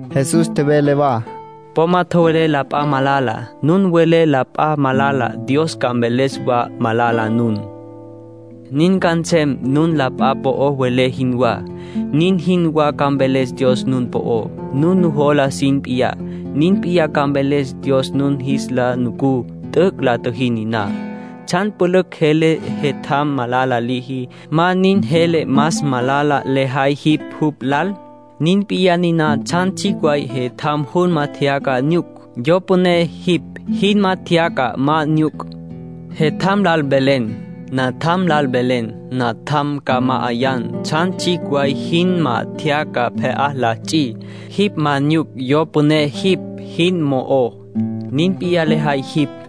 Jesús tjevele wa: “Po ma tjowelé la p'a malala. Nun welé wa la p'a malala, Dios ca mveles wa malala nun. Nin ca nsem, nun la p'a po'o welé jinwá, nin jinwá ca mveles Dios nun po'ó. Nun nujola jin p'iyá, nin p'in ca mveles Dios nun jis lal ncu t'üc' la tjüjí niná. ”¿Tsjan pjucj jele jetjam malala liji, ma nin jele más malala lejay jipj jupj lal? Nin p'iyá niná tsjan tsjicj way jetjam junma tjeyaca nyuc; yo püné jipj jinma tjeyaca ma nyuc. Jetjam lal velen: ‘Natjam, ca ma'ayan tsjan tsjicj way jinma tjeyaca pje'á li ts'i’. Jipj ma nyuc yo püné jipj jin mo'ó. Nin p'iyá lejay jipj.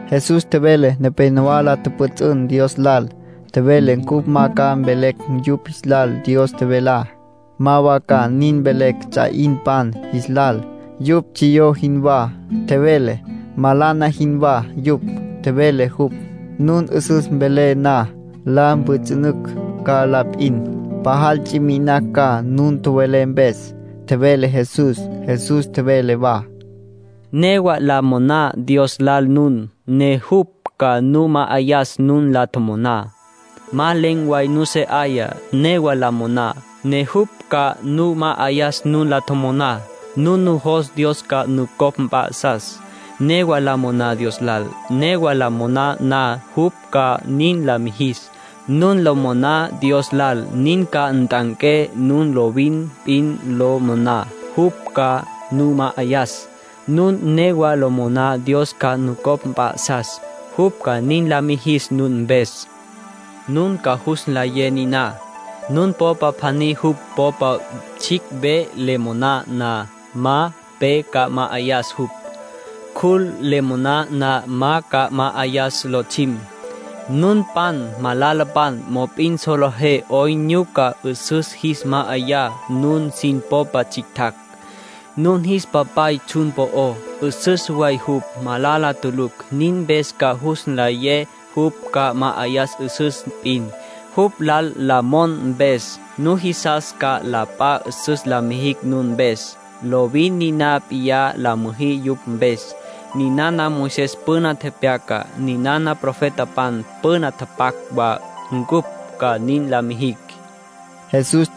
Jesús tjevele nepénowa la pjüts'ünpan Dios lal. Tjevele cupj ma ca mvelecj yupj jis lal Dios tjevelá. Ma wa ca nin mvelecj ts'a 'inpan jis lal. Yupj tsjiyó jinwá, tjevele. Malana jinwá yupj, tjevele jupj. Nun 'üsüs welé na, la mpjüts'ünücj ca la p'in. Pajal ts'i mi'inacj ca nun tjowelé mpes, tjevele Jesús. Jesús tjevele wa: “Newa la moná Dios lal nun, ne jupj ca nu ma'ayas nun la tjomoná. Ma len̈ way nusé 'aya, newa la moná, ne jupj ca nu ma'ayas nun la tjomoná. Nun nujos Dios ca nucopj mp'a'sas, newa la moná Dios lal. Newa lo moná na, jupj ca nin la mijis. Nun lo moná Dios lal, nin ca nt'anqué. Nun lovin p'in lo moná, jupj ca nu ma'ayas. Nun newa lo moná Dios ca nucopj mp'a'sas, jupj ca nin la mijis nun mpes. ”Nun ca jus nlayé niná. Nun popa pjaní jupj popa tsjicj ve le moná na, ma pe ca ma'ayas jupj. Cjul le moná na, ma ca ma'ayas lotsjim. Nunpan malalapan, mop'in solejé 'oyn nyuca 'üsüs jis ma'ayá nun sin popa tsjictjacj. Nun jis Papay tsjun po'ó, 'üsüs way jupj, malala tulucj. Nin mpes ca jus nlayé jupj ca ma'ayas 'üsüs p'in, jupj lal la mon mpes. ”Nujisas ca la p'a 'üsüs la mijicj nun mpes. Lovin niná p'iyá la müjí yupj mpes. Ninana Moisés püna tepyaca. Niná profetapan püna tapac wa ncupj ca nin la mijicj”, nin tjevele Jesús.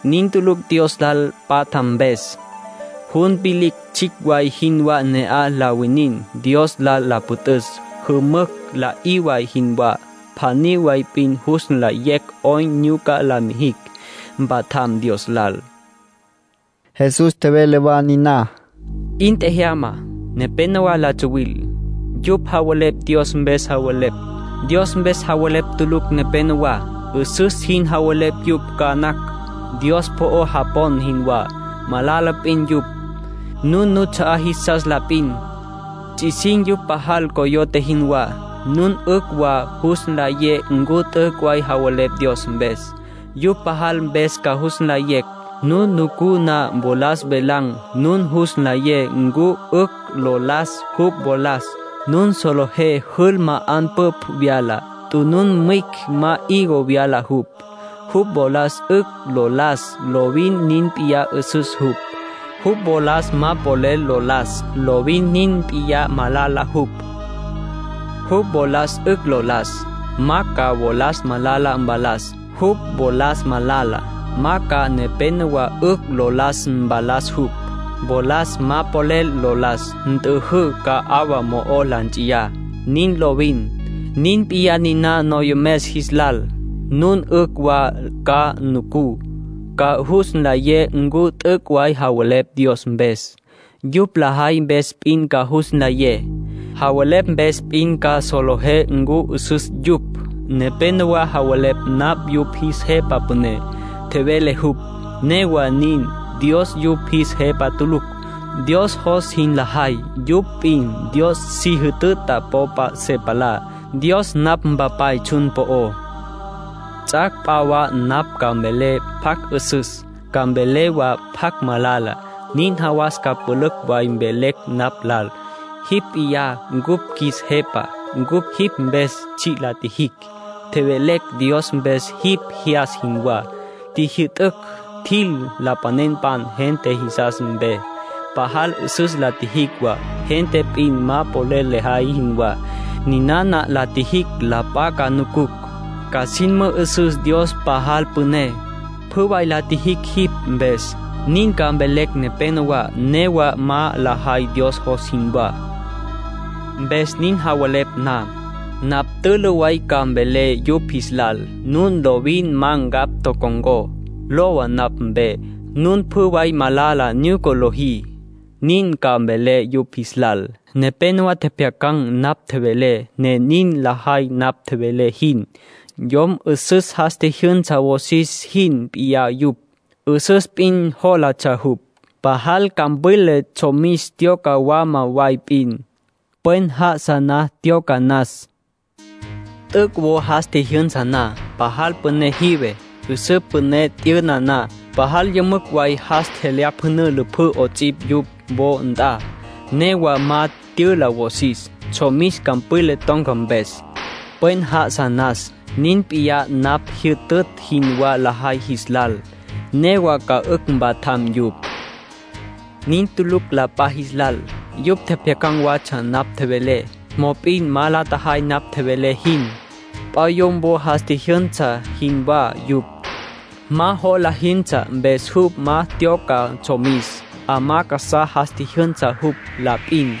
Nin tulucj Dios lal patja mpes. Jun vilicj tsjicj way jinwá ne'aj la winin, Dios lal la püt'üs. Jümücj la'í way jinwá. Pjaní way p'in jus nlayecj 'oyn nyuca la mijicj, mpatjam Dios lal.” Jesús tjevele wa niná: “'In tjajama. Nepénowa la tsuwil. Yupj javelepj Dios mpes javelepj. Dios mpes javelepj tulucj nepenowá. 'Üsüs jin javelepj yupj ca nacj, Dios po'o japon jinwá. Malala p'in yupj. Nun nuts'a'á jisas la p'in. Ts'isin̈ yupj pajal, coyote jinwá. Nun 'ücj wa jus nlayé ncu t'üc' way javelepj Dios mpes. Yupj lajay mpes ca jus nlayé. Nun nucú na wolas velan̈, nun jus nlayé ncu 'ücj lo las jupj wolas. Nun solejé jül ma 'anpüpj vyala. Tunun mwicj ma higo vyala jupj. Jupj wolas 'ücj lo las, lovin nin p'iyá 'üsüs jupj. Jupj wolas ma polel lo las, lovin nin p'iyá malala jupj. Jupj wolas 'ücj lo las, ma ca wolas malala mvalas. Jupj wolas malala, ma ca nepénowa 'ücj lo las mvalas jupj. Wolas ma polel lo las, nt'üjǘ, ca 'awa mo'o la nts'iyá. Nin lovin. Nin p'iyá niná noyomes jis lal. Nun 'ücj wa ca nucú, ca jus nlayé ncu t'üc' way javelepj Dios mpes. Yupj lajay mpes p'in ca jus nlayé. ”Javelepj mpes p'in ma solejé ncu 'üsüs yupj. Nepénowa javelepj napj yupj jis Jepa Püné —tjevele jupj—. Newa nin, Dios yupj jis Jepa tulucj. Dios jos jin lajay, yupj p'in Dios si jütüta popa se palá. Dios napj Mpapay tsjun po'ó. Ts'ac' p'a wa napj ca mvelé pjacj 'üsüs, ca mvelé wa pjacj malala. Nin jawas ca pülücj way mvelecj napj lal: ‘Jipj p'iyá cupj qjuis Jepa. Cupj jipj mpes tsji' la tjijicj. Tjevelecj Dios mpes jipj jyas jinwá. Tjijyü'tücj tjil lapanenpan gente jisas mpe. Pajal 'üsüs la tjijicj wa, gente p'in ma polel lajay jinwá. Ninana la tjijicj la p'a ca nucucj, ca sin mü'üsüs Dios pajal püné. Pjü way la tjijicj jipj mpes.’ Nin ca mvelecj nepenowá. Newa ma la tjajay Dios jos jinwá. Mpes nin javelepj na, napj tülü way ca mvelé yupj jis lal: ‘Nun lovin ma ncapj tocon̈có. Lowa napj mpe. Nun pjü way malala nyuca lojí.’ Nin ca mvelé yupj jis lal. ”Nepénowa tjepjyacan̈ napj tjevelé, ne nin lajay napj tjevelé jin. Yom 'üsüs jas tjijyünsa wosis jin p'iyá yupj. 'Üsüs p'in jólatsja jupj. Pajal campwila tsjomis tyoca mwalá way p'in, pwen já'asa na tyoca nas. T'üc' wo jas tjijyünsa na, pajal püné tjive. 'Üsǘ püné t'yüna wa. Pajal yümücj way jas tjelyapjünǘ lüpjǘ 'ots'ipj jupj wo nt'a. Newa ma tyüla wosis, tsjomis campwila ton̈ca mpes, pwen já'asa nas. Nin p'iyá napj jyütütj jinwá lajay jis lal. Newa ca 'ücj mpatjam yupj. Nin tulucj la p'a jis lal. Yupj tjepjyacan̈ watsja napj tjevelé. Mop'in ma la tjajay napj tjevelé jin. P'a yom wo jas tjijyünsa jinwá yupj. Ma jola jintsja, mpes jupj ma tyoca tsjomis. 'Amá casá jas tjijyünsa jupj la p'in.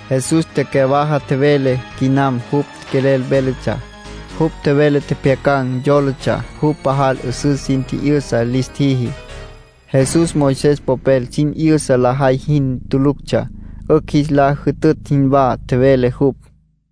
Jesús tecyawaja tjevele quinam jupj quelel véletsja. Jupj tjevele tjepjyacan̈ yólatsja jupj pajal 'üsüs sin tji'yüsa lis tjiji. Jesús Moisés popel sin 'yüsa lajay jin tuluctsja. 'Ücj jis la jütütj jinwá tjevele jupj.